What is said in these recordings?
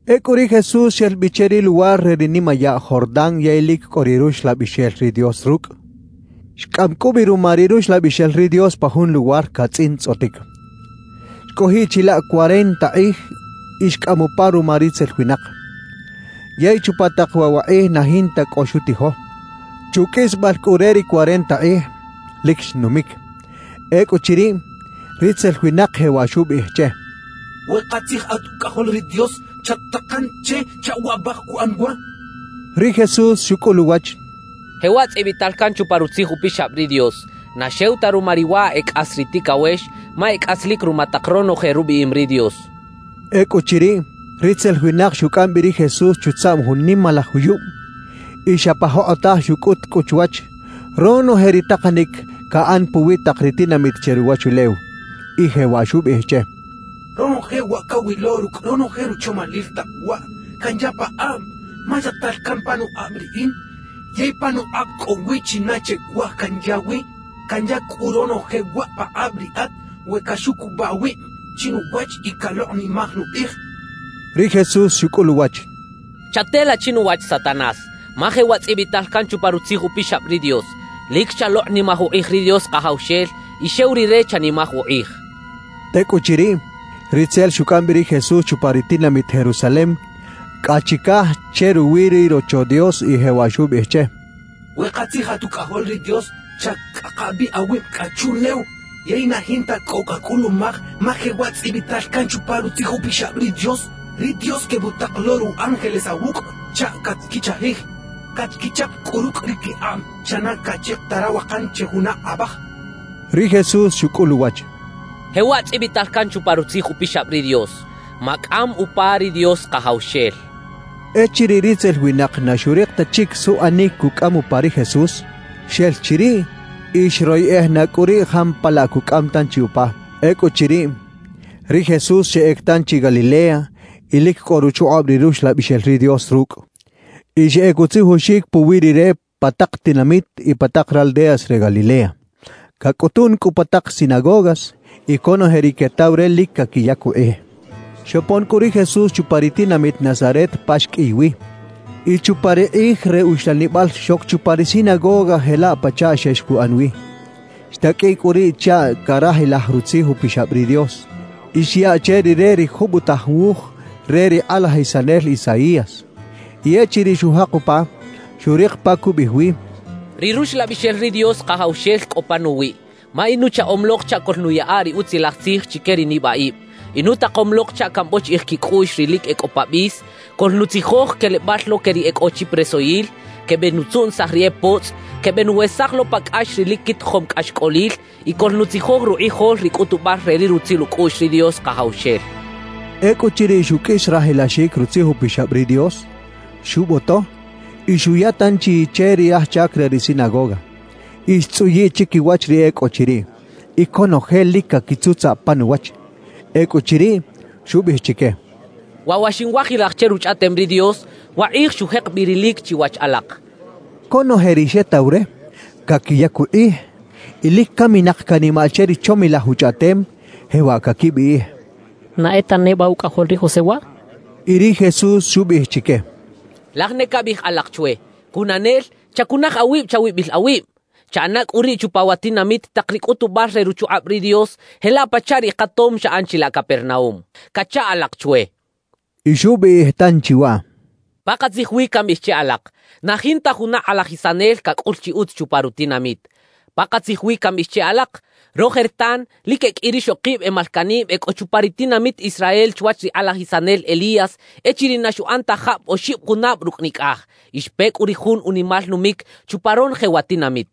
Ecꞌu ri Jesús xel bi che ri luwar re ri nimayaꞌ Jordán yey lic cꞌo ri Ruxlabixel ri Dios rucꞌ. Xcꞌam cꞌu bi ruma ri Ruxlabixel ri Dios pa jun luwar catzꞌintzꞌotic. Xcꞌojiꞌ chilaꞌ cuarenta kꞌij y xcꞌam upa ruma ritzel winak. Yey chupa tak waꞌ wa kꞌij na jinta cꞌo xutijo. Chuqꞌuisbal cꞌu re ri cuarenta kꞌij, lic xnumic. Ecꞌuchiriꞌ, ritzel winak jewaꞌ xubiꞌij che: —We katzij at Ucꞌajol ri Dios, chat-takan che chaꞌ waꞌbaj cuꞌan wa —xcha che. Ri Jesús xucꞌul uwach: —Jewaꞌ tzꞌibital can chupa Rutzij Upixab ri Dios: Na xew ta ruma ri wa e cꞌas ri ticawex; ma e cꞌaslic ruma tak ronoje rubiꞌim ri Dios —xchaꞌ. Ecꞌuchiriꞌ, ritzel winak xucꞌam bi ri Jesús chutzaꞌm jun nimalaj juyub y xa pa jokꞌotaj xucꞌut cꞌu chwach, ronoje ri takanic caꞌan puwi tak ri tinamit che ruwachulew y jewaꞌ xubiꞌij che: —Ronoje wa cawilo rucꞌ ronoje ruchomalil tak waꞌ, canya pakꞌab, ma yaꞌtal can panukꞌab riꞌin yey panukꞌab cꞌo wi china che cuaj canya wi. Canya cꞌu ronoje waꞌ pakꞌab riꞌat we caxucubaꞌ awib chinuwach y calokꞌnimaj nukꞌij —xcha che. Ri Jesús xucꞌul uwach: —Chatela chinuwach Satanás, ma jewaꞌ tzꞌibital can chupa Rutzij Upixab ri Dios: Lic chalokꞌnimaj ukꞌij ri Dios Kajawxel y xew Rire chanimaj ukꞌij —xchaꞌ. Tecꞌuchiriꞌ, ritzel xucꞌam bi ri Jesús chupa ri tinamit Jerusalem cꞌa chicaj che ruwi ri Rocho Dios y jewaꞌ xubiꞌij che: —We katzij at Ucꞌajol ri Dios, chacꞌaka bi awib cꞌa chuꞌlew yey na jinta cꞌo cacꞌulumaj, ma jewaꞌ tzꞌibital can chupa Rutzij Upixab ri Dios: Ri Dios quebutak lo ru ángeles awucꞌ chaꞌ catquichajij. Catquichap cꞌu rucꞌ ri quikꞌab chaꞌ na caꞌchika ta rawakan che juna abaj —xchaꞌ. Ri Jesús xucꞌul uwach: —Jewaꞌ tzꞌibital can chupa Rutzij Upixab ri Dios: Macꞌam upa ri Dios Kajawxel —xchaꞌ. Echiriꞌ ritzel winak na xurik ta chic suꞌanic cucꞌam upa ri Jesús, xel chiriꞌ y xroyeꞌej na cꞌu riꞌ jampalaꞌ cucꞌam tanchi upa. Ecꞌuchiriꞌ, ri Jesús xeꞌec tanchi Galilea y lic cꞌo ruchukꞌab ri Ruxlabixel ri Dios rucꞌ. Y xeꞌec utzijoxic puwi Rire pa tak tinamit y pa tak raldeas re Galilea. Cacꞌutun cꞌu pa tak sinagogas y conoje ri quetaw re lic caquiyac ukꞌij. Xopon cꞌu ri Jesús chupa ri tinamit Nazaret pa xqꞌuiy wi. Y chupa ri kꞌij re uxlanibal xoc chupa ri sinagoga jelaꞌ pachaꞌ xex cuꞌan wi. Xtaqꞌuiꞌ cꞌu riꞌ chaꞌ carajilaj Rutzij Upixab ri Dios. Y xyaꞌ che Rire ri jubotaj wuj re ri kꞌalajisanel Isaías. Y echiriꞌ xujak upa, xurik pa cubiꞌij wi: Ri Ruxlabixel ri Dios Kajawxel cꞌo panuwiꞌ, ma inuchaꞌom lok chaꞌ coꞌlnuyaꞌa ri Utzilaj Tzij chique ri nibaꞌib. Inutakom lok chaꞌ cambochiꞌij quicꞌuꞌx ri lic e cꞌo pa bis, coꞌlnutzijoj quelebal lo que ri e cꞌo chi presoyil, quebenutzuꞌnisaj ri e potzꞌ, quebenuwesaj lo pa cꞌax ri lic quitijom cꞌaxcꞌolil, y coꞌlnutzijoj rukꞌijol ri cꞌutubal re ri rutzil ucꞌuꞌx ri Dios Kajawxel. Ecꞌuchiriꞌ xuqꞌuis rajilaxic Rutzij Upixab ri Dios, xuboto y xuya tanchi che ri aj chac re ri sinagoga, y xtzꞌuyiꞌ chiquiwach ri e cꞌo chiriꞌ. Y conoje lic caquitzutzaꞌ pan uwach. Ecꞌuchiriꞌ, xubiꞌij chique: «Waꞌ wa xinwajilaj che Ruchꞌaꞌtem ri Dios, wakꞌij xujek bi rilic chiwach alak» xchaꞌ. Conoje ri xetaw re, caquiyac ukꞌij y lic caminak canimaꞌ che ri chomilaj uchꞌaꞌtem, jewaꞌ caquibiꞌij: «¿Na e ta neba ucꞌajol ri José waꞌ?» quechaꞌ. Y ri Jesús xubiꞌij chique: «Laj ne cabiꞌij alak chwe: “Cunanel, chacunaj awib chawibil awib. Chaꞌana cꞌu riꞌ chupa wa tinamit tak ri cꞌutubal re ruchukꞌab ri Dios jelaꞌ pachaꞌ ri katom xaꞌan chilaꞌ Capernaúm” cacha alak chwe.» Y xubiꞌij tanchi waꞌ: «Pakatzij wi cambiꞌij che alak: Na jinta juna kꞌalajisanel cacꞌul chi utz chupa rutinamit. Pakatzij wi cambiꞌij che alak: Rojertan lic e qꞌui rixokib e malcaꞌnib e cꞌo chupa ri tinamit Israel chwach ri kꞌalajisanel Elías echiriꞌ na xuꞌan ta jab oxib junab rucꞌ nicꞌaj y xpe cꞌu ri jun unimal numic chupa ronoje wa tinamit.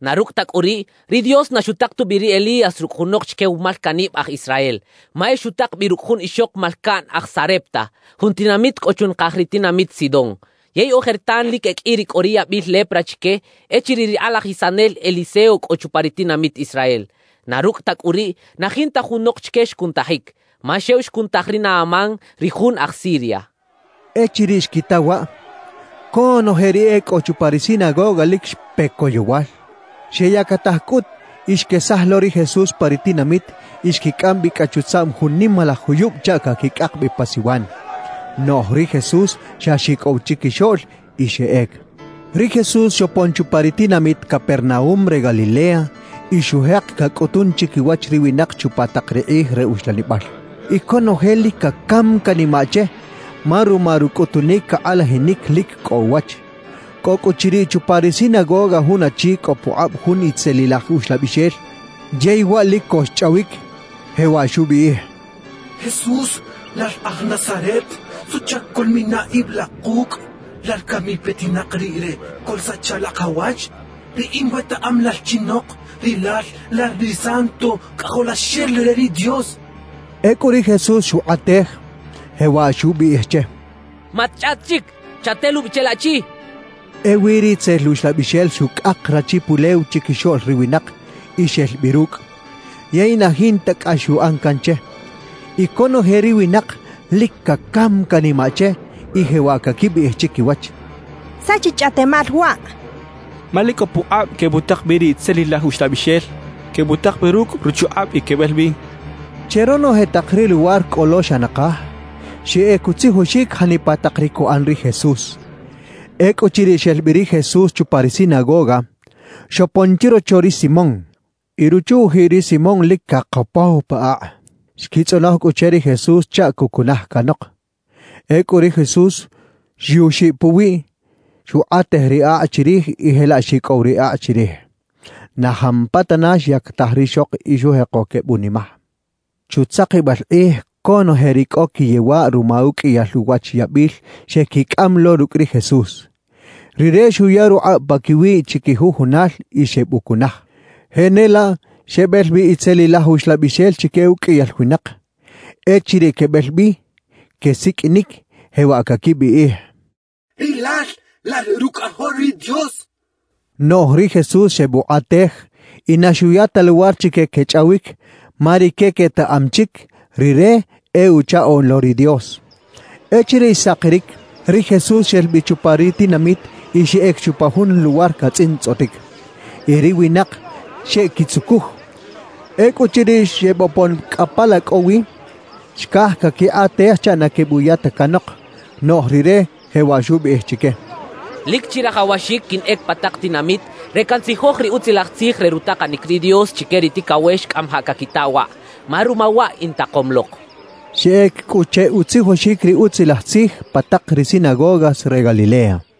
Na rucꞌ ta cꞌu riꞌ, ri Dios na xutak tubi ri Elías rucꞌ junok chique wa malcaꞌnib aj Israel; ma e xutak bi rucꞌ jun ixok malcaꞌn aj Sarepta, jun tinamit cꞌo chunakaj ri tinamit Sidón. Yey ojertan lic e qꞌui ri cꞌo ri yabil lepra chique echiriꞌ ri kꞌalajisanel Eliseo cꞌo chupa ri tinamit Israel. Na rucꞌ ta cꞌu riꞌ, na jinta junok chique xcunutajic, ma xew xcunutaj ri Naamán, ri jun aj Siria» xchaꞌ. Echiriꞌ xquita waꞌ, conoje ri e cꞌo chupa ri sinagoga lic xpe coyowal. Xeyactaj cꞌut y xquesaj lo ri Jesús pa ri tinamit y xquicꞌam bi cꞌa chutzaꞌm jun nimalaj juyub chaꞌ caquicꞌak bi pa siwan. Noꞌj ri Jesús xa xicꞌow chiquixoꞌl y xeꞌec. Ri Jesús xopon chupa ri tinamit Capernaúm re Galilea y xujek cacꞌutun chiquiwach ri winak chupa tak ri kꞌij re uxlanibal. Y conoje lic cacam canimaꞌ che, ma ruma rucꞌutunic cakꞌalajinic lic cꞌo uwach. Cꞌo cꞌu chiriꞌ chupa ri sinagoga jun achi cꞌo pukꞌab jun itzelilaj uxlabixel, yey waꞌ lic co xchꞌawic, jewaꞌ xubiꞌij: —Jesús, lal aj Nazaret, ¿suꞌchac coꞌlmina ib la kucꞌ? ¿Lal cami petinak riꞌ re coꞌlsacha la kawach? Riꞌin wetaꞌam lal chinok, rilal lal ri Santo Cꞌajolaxel re ri Dios —xchaꞌ. Ecꞌu ri Jesús xukꞌatej, jewaꞌ xubiꞌij che: —¡Matchꞌaꞌt chic! Chatelubi che laꞌchi —xchaꞌ. Ewi ri itzel uxlabixel xucꞌak rachi pulew chiquixoꞌl ri winak y xel bi rucꞌ. Yey na jinta cꞌax xuꞌan can che. Y conoje ri winak lic cacam canimaꞌ che y jewaꞌ caquibiꞌij chiquiwach: «¿Saꞌ chi chꞌaꞌtemal waꞌ? Ma lic cꞌo pukꞌab quebutak bi ri itzelilaj uxlabixel. Quebutak bi rucꞌ ruchukꞌab y quebel bi» quechaꞌ. Che ronoje tak ri luwar cꞌo lo xa nakaj, xeꞌec utzijoxic janipa tak ri cuꞌan ri Jesús. Ecꞌuchiriꞌ xel bi ri Jesús chupa ri sinagoga, xopon chirocho ri Simón. Y ruchu-ujiꞌ ri Simón lic cakopow pa akꞌ. Xquitzꞌonoj cꞌu che ri Jesús chaꞌ cucunaj canok. Ecꞌu ri Jesús xyuxiꞌ puwiꞌ, xukꞌatej ri akꞌ chirij y jelaꞌ xicꞌow ri akꞌ chirij. Na jampatana xyactaj rixok y xujeko quebunimaj. Chutzakibal kꞌij conoje ri cꞌo quiyewaꞌ ruma uqꞌuiyal uwach yabil xequicꞌam lo rucꞌ ri Jesús. Rire xuya rukꞌab paquiwiꞌ chiquijujunal y xebucunaj. Jenelaꞌ xebel bi itzelilaj uxlabixel chique uqꞌuiyal winak. Echiriꞌ quebel bi, quesiqꞌuinic, jewaꞌ caquibiꞌij: «¡Rilal lal Rucꞌajol ri Dios!» quechaꞌ. Noꞌj ri Jesús xebukꞌatej y na xuya ta luwar chique quechꞌawic, ma rique quetaꞌam chic Rire e Uchaꞌoꞌn lo ri Dios. Echiriꞌ xsakiric, ri Jesús xel bi chupa ri tinamit y xeꞌec chupa jun luwar catzꞌintzꞌotic. Y ri winak xeꞌquitzucuj. Ecꞌuchiriꞌ xebopon cꞌa pa la cꞌo wi, xcaj caquikꞌatej chaꞌ na quebuya ta canok. Noꞌj Rire jewaꞌ xubiꞌij chique: «Lic chirajawaxic quinꞌec pa tak tinamit re cantzijoj ri Utzilaj Tzij re rutakanic ri Dios chique ri ticawex cꞌamajaꞌ caquita waꞌ, ma ruma waꞌ intakom lok» xchaꞌ. Xeꞌec cꞌu che utzijoxic ri Utzilaj Tzij pa tak ri sinagogas re Galilea.